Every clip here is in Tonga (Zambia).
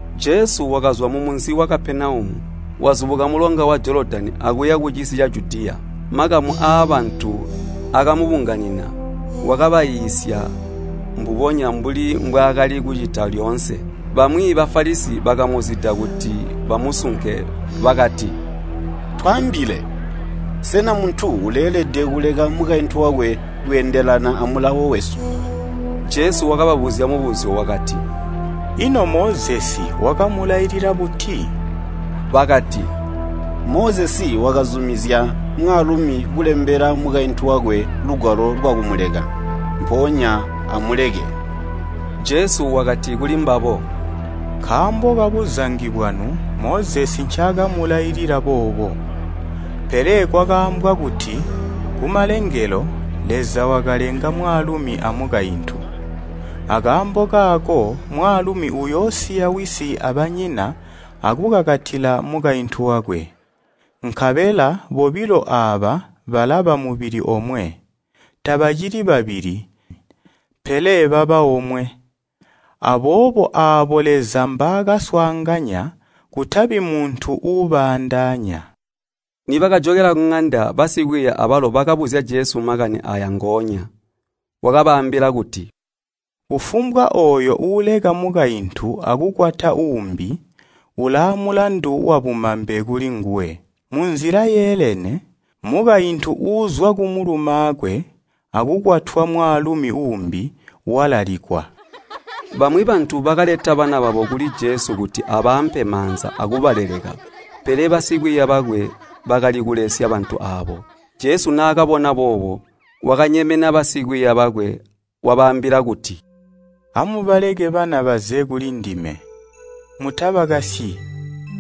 Jesu wakazwa mumunzi wa Kapenaumu, wazubuka mulonga wa Jolodani akuya kucisi ca Judiya. Makamu aabantu akumubunganina, wakabaiisya mbubonya mbuli mbwaakali kucita lyoonse. Bamwi Bafalisi bakamuzida kuti bamusunke bakati, “Twaambile, sena muntu uleelede kuleka mukaintu wakwe kweendelana amulawo wesu?” Jesu wakababuzya mubuzyo wakati, “Ino Mozesi wakamulailila buti?” Bakati, “Mozesi wakazumizya mwaalumi kulembela mukaintu wakwe lugwalo lwakumuleka, mpoonya amuleke.” Jesu wakati kulimbabo, “Nkaambo kabuzangi bwanu Mozesi ncaakamulailila boobo. Pele kwakaambwa kuti, kumalengelo, ‘Leza wakalenga mwaalumi amukaintu. Akaambo kaako mwaalumi uyoosiya wisi abanyina akukakatila mukaintu wakwe, nkabela bobilo aaba balaba mubili omwe.’ Tabacili babili, pele baba omwe. Aboobo aabo Leza mbaakaswaanganya kutabi muntu uubaandaanya.” Nibakajokela kuŋanda, basikwiiya abalo bakabuzya Jesu makani aaya ngoonya. Wakabaambila kuti, “Kufumbwa ooyo uuleka mukaintu akukwata uumbi, ulaamulandu wabumambe kulinguwe. Munzila yeelene, mukaintu uuzwa kumulumaakwe akukwatwa mwaalumi uumbi, walalikwa.” Bamwi bantu bakaleta bana babo kuli Jesu kuti abaampe maanza akubaleleka, pele basikwiiya bakwe bakalikulesya bantu aabo. Jesu naakabona boobo, wakanyemena basikwiiya bakwe wabaambila kuti, “Amubaleke bana baze kulindime, mutabakasyi,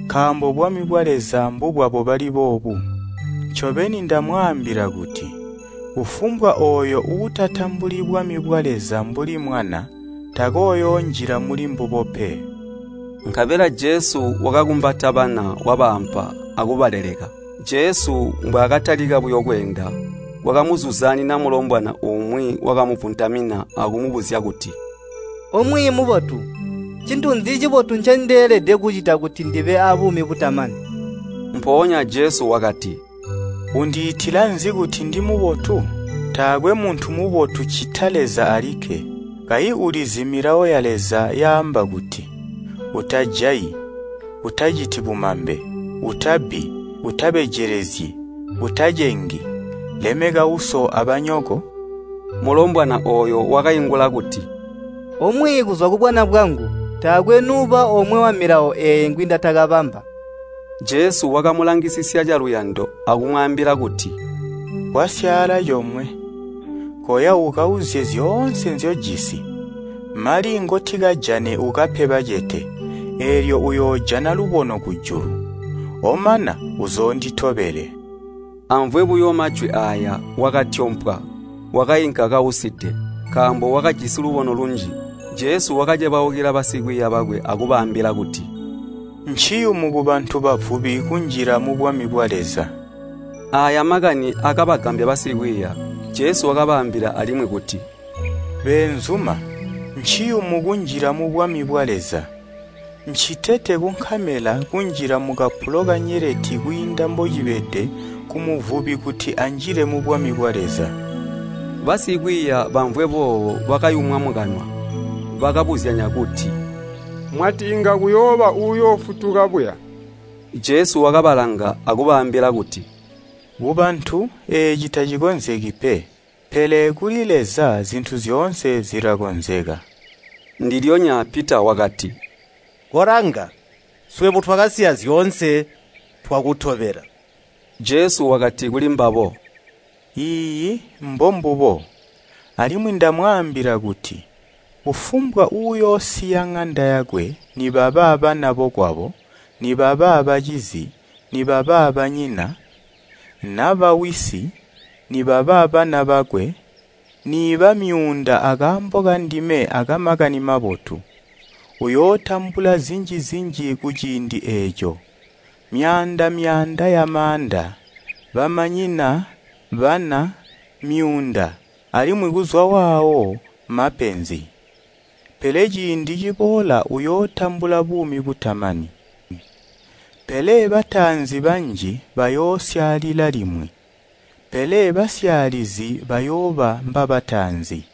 nkaambo bwami bwa Leza mbubwabo bali boobu. Ncobeni ndamwaambila kuti kufumbwa ooyo uutatambuli bwami bwa Leza mbuli mwana, takooyoonjila mulimbubo pe.” Nkabela Jesu wakabakumbata bana wabaampa akubaleleka. Jesu mbwaakatalika buyo kweenda, kwakamuzuzaanina mulombwana umwi wakamuvuntamina akumubuzya kuti, “O Mwiiyi mubotu, ncintu nzi cibotu ncendeelede kucita kuti ndibe aa buumi butamani?” Mpoonya Jesu wakati, “Undiitila nzi kuti ndimubotu? Taakwe muntu mubotu ccita Leza alikke. Kayi ulizi milawo ya Leza yaamba kuti, ‘Utajayi, utaciti bumambe, utabbi, utabejelezyi, utacengi, lemeka uso abanyoko?’” Mulombwana ooyo wakaingula kuti, “O Mwiiyi kuzwa kubwana bwangu taakwe nuuba omwe wamilawo eeyi ngwindatakabamba.” Jesu wakamulangisisya caluyando akumwaambila kuti, “Kwasyaala comwe. Koya ukauzye zyoonse nzyojisi, mali ngotikajane ukape bacete, eelyo uyoojana lubono kujulu, omana uzoonditobele.” Amvwe buyo majwi aaya, wakatyompwa, wakainka kauside, nkaambo wakajisi lubono lunji. Jesu wakacebaukila basikwiiya bakwe akubaambila kuti, “Nciyumu kubantu bavubi kunjila mubwami bwa Leza!” Aaya makani akabagambya basikwiiya. Jesu wakabaambila alimwi kuti, “Beenzuma, nciyumu kunjila mubwami bwa Leza. Ncitete kunkamela kunjila mukapulo kanyeleti kwiinda mbocibede kumuvubi kuti anjile mubwami bwa Leza.” Basikwiiya bamvwe boobo bakayumwa mukanwa, bakabuzyanya kuti, “Mwati inga kuyooba uyoofutuka buya?” Jesu wakabalanga akubaambila kuti, “Kubantu eeci tacikonzeki pe, pele kuli Leza zintu zyoonse zilakonzeka.” Ndilyonya Pita wakati, “Kolanga, swebo twakasiya zyoonse twakutobela.” Jesu wakati kulimbabo, “Iiyi mbombubo, alimwi ndamwaambila kuti kufumbwa uuyoosiya ŋanda yakwe, nibaba bana bokwabo, nibaba bacizi, nibaba banyina, naba wisi, nibaba bana bakwe, niiba myuunda akaambo kandime aka Makani Mabotu, uyootambula zinji-zinji kuciindi eeco, myaanda-myaanda yamaanda, bamanyina, bana, myuunda, alimwi kuzwaawo mapenzi. Pele ciindi ciboola uyootambula buumi butamani. Pele bataanzi banji bayoosyaalila limwi, pele basyaalizi bayooba mbabataanzi.”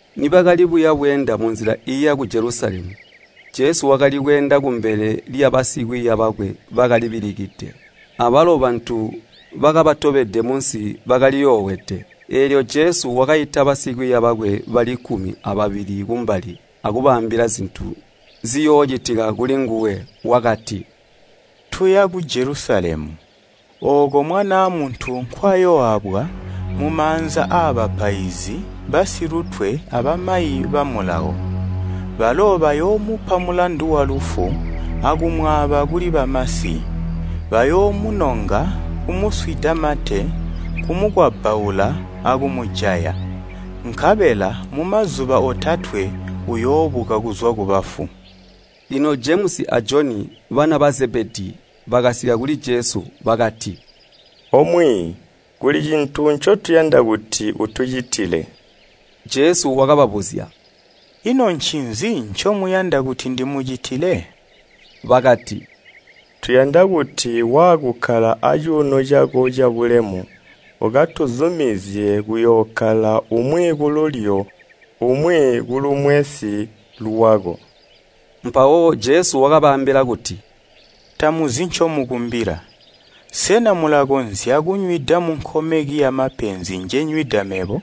Nibakali kuya bweenda munzila iiya ku Jelusalemu, Jesu wakali kweenda kumbele lyabasikwiiya bakwe bakalibilikide. Abalo bantu bakabatobede munsi bakaliyoowede. Eelyo Jesu wakaita basikwiiya bakwe bali kkumi ababili kumbali akubaambila zintu ziyoocitika kulinguwe. Wakati, “Tuya ku Jelusalemu, ooko Mwanaa Muntu nkwayooabwa mumaanza aabapaizi basilutwe abamayi ba Mulawo. Balo bayoomupa mulandu walufu akumwaaba kuli bamasi. Bayoomunonga, kumuswida mate, kumukwabbaula akumujaya. Nkabela mumazuba otatwe uyoobuka kuzwa kubafu.” Lino Jemusi a Joni, bana ba Zebedii, bakasika kuli Jesu. Bakati, “O Mwiiyi, kuli cintu ncotuyanda kuti utucitile.” Jesu wakababuzya, “Ino ncinzi ncomuyanda kuti ndimucitile?” Bakati, “Tuyanda kuti waakukkala acuuno cako cabulemu, ukatuzumizye kuyookkala umwi kululyo umwi kulumwensi lwako.” Mpawo Jesu wakabaambila kuti, “Tamuzi ncomukumbila. Sena mulakonzya kunywida munkomeki yamapenzi njenywida mebo?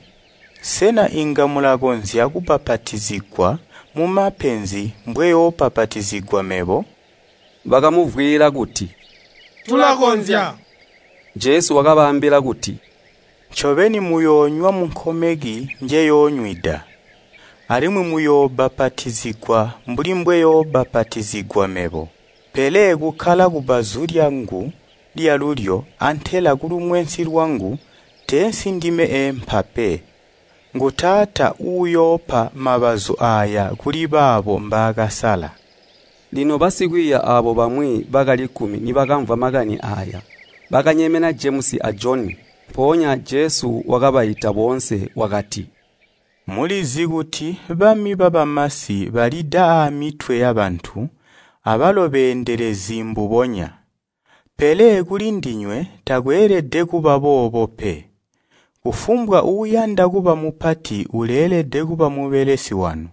Sena inga mulakonzya kubbapatizigwa mumapenzi mbweyoobbapatizigwa mebo?” Bakamuvwiila kuti, “Tulakonzya.” Jesu wakabaambila kuti, “Ncobeni muyoonywa munkomeki njeyoonywida, alimwi muyoobbapatizigwa mbuli mbweyoobbapatizigwa mebo. Pele kukkala kubbazu lyangu lyalulyo antela kulumwensi lwangu teensi ndime eempa pe. Ngu Taata uuyoopa mabazu aaya kuli baabo mbaakasala.” Lino basikwiiya aabo bamwi bali kkumi nibakamvwa makani aaya, bakanyemena Jemusi a Joni. Mpoonya Jesu wakabaita boonse wakati, “Mulizi kuti bami babamasi balida aamitwe yabantu abalo beendelezi mbubonya. Pele kuli ndinywe takweelede kuba boobo pe. Kufumbwa uuyanda kuba mupati uleelede kuba mubelesi wanu.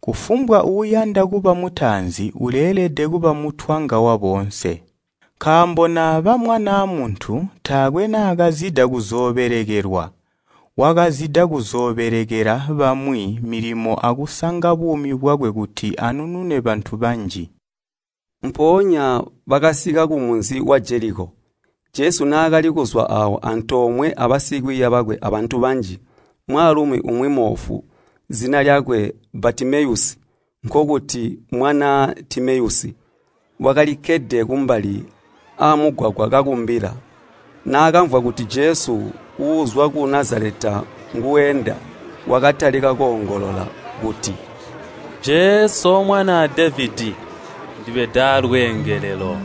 Kufumbwa uuyanda kuba mutaanzi, uleelede kuba mutwanga waboonse. Nkaambo Mwanaa Muntu taakwe naakazida kuzoobelekelwa, wakazida kuzoobelekela bamwi milimo akusanga buumi bwakwe kuti anunune bantu banji.” Mpoonya bakasika kumunzi wa Jeliko. Jesu naakali kuzwa aawo antoomwe abasikwiiya bakwe abantu banji, mwaalumi umwi moofu, zina lyakwe Batimeyusi, nkokuti, mwanaa Timeyusi, wakalikkede kumbali aamugwagwa kakumbila. Naakamvwa kuti Jesu uuzwa ku Nazaleta nguuenda, wakatalika koongolola kuti, “Jesu, O Mwanaa Devedi, ndibeda aalweengelelo!”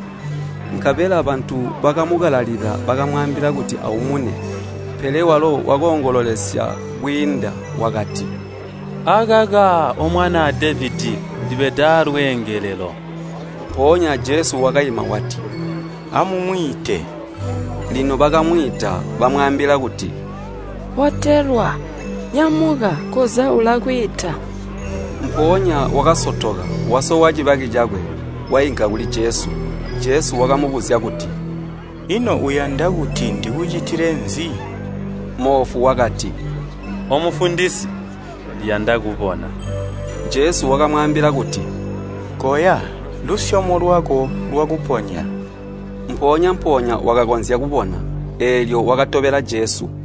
Nkabela bantu bakamukalalila, bakamwaambila kuti aumune. Pele walo wakoongololesya kwiinda, wakati, “Akaka, O Mwanaa Devedi, ndibeda aalweengelelo!” Mpoonya Jesu wakaima wati, “Amumwiite.” Lino bakamwiita. Bamwaambila kuti, “Botelwa! Nyamuka, koza ulakwiita.” Mpoonya wakasotoka, wasowa cibaki cakwe, wainka kuli Jesu. Jesu wakamubuzya kuti, “Ino uyanda kuti ndikucitile nzi?” Moofu wakati, “O Mufundisi, ndiyanda kubona.” Jesu wakamwaambila kuti, “Koya, lusyomo lwako lwakuponya.” Mpoonya-mpoonya wakakonzya kubona, eelyo wakatobela Jesu.